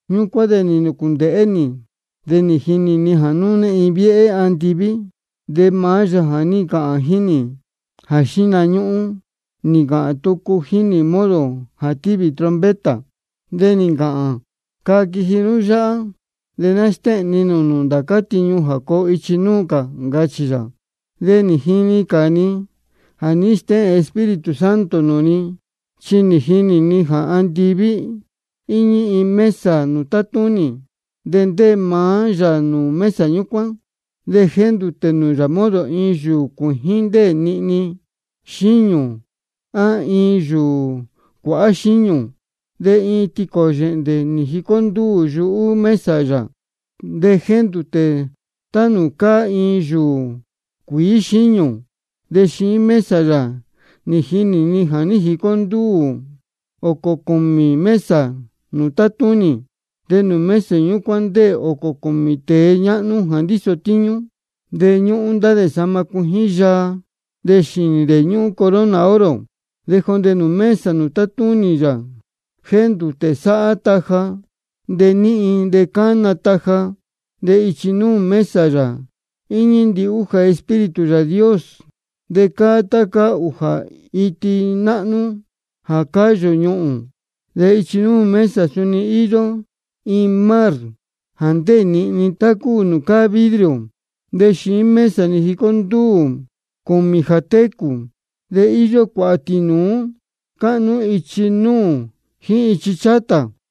Ñúcuán de nī nūcūndēhé nī, de nī jinī ni jā núne iin viéhé andiví, de maá Yāā jā ní ncāhān jíín nī jā xíhna ñúhún, nī ncāhān tucu jíín nī modo jā tívī trompeta. De nī ncāhān: Caa quiji nú yáhá, de ná stéhēn ni nūū nū ndācá tiñu jā coo ichi núū cā, ncachī yā. De nī jinī cā ni jā ní stéhēn Espíritu Santo nūū ni. Chi nī jinī ni jā andiví íñí iin mesa nūū tátúnī, de ndéē maá yā nūū mesa ñúcuán. De jéndūtē yā modo iin yūū cuījín ndéē nihni xíñū á iin yūū cuāhá xíñū. De iin tīcō yēhndé nī jicó ndúū yuhú mesa yā, de jéndūtē tá nūū cáá iin yūū cuīí xíñū. De xiín mesa yā nī jinī ni jā ní jicó ndúū ōcō cūmī cā mesa nūū tátúnī. De nūū mesa ñúcuán ndéē ōcō cūmī tēe ñáhnú jā ndíso tíñú. De ñúhún ndá dē sahma cuijín yaa, de xīnī dē ñúhún corona oro. De jondē nūū mesa nūū tátúnī yā jéndūtē sáhá taja de níhin de cána taja. De ichi núū mesa yā íñí ndihújā Espíritu Yāā Dios, de cáá tá cáá ūjā iti náhnú jā cáyū ñuhūn. De ichi núū mesa yā suni íyó modo iin mar jā ndéē nihni tá cúu nūū cáá vidrio. De xiín mesa yā nī jicó ndúū cūmī jā técū. De íyó cuāhā tīnūú níí cáhnú ichi núū jíín ichi chátā.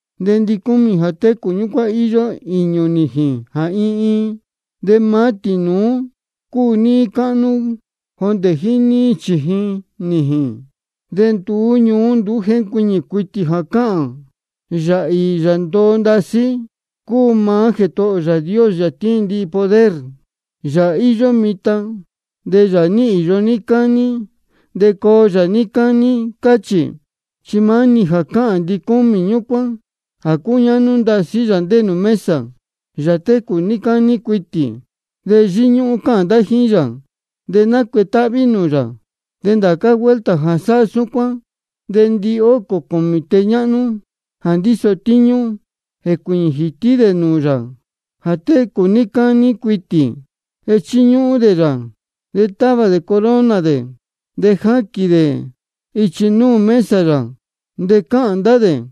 De ndicúmī jā técū ñúcuán íyó īñū nījīn jā iin iin. De maá-ni tīnūú cúu níí cáhnú jondē jíín níí chījin nījīn. De nduú ñuú nduú jéncuiñī cuitī jā cáhān: Yāā īī Yāā ndoo ndasí cúu maá Jētohō ō Yāā Dios, Yāā tíin ndihi poder, Yāā íyó mitan, de nī īyo yā níí cání, de coo yā níí cání. Cáchī. Chi maá-ni jā cáhān ndicúmī ñúcuán jā cúñáhnú ndasí Yāā ndéē nūū mesa, Yāā técū níí cání cuitī. De yíñúhún cáhān ndá jíín yā, de nácuetáhví nūū yā. De ndācá vuelta jā sáhá súcuán, de ndihócō cūmī tēe ñáhnú jā ndíso tíñú, jécuīñī jītí dē nūū Yāā jā técū níí cání cuitī, de chíñúhún dē yā. De távā dē corona dē, de jáquīn dē ichi núū mesa yā. De cáhān ndá dē: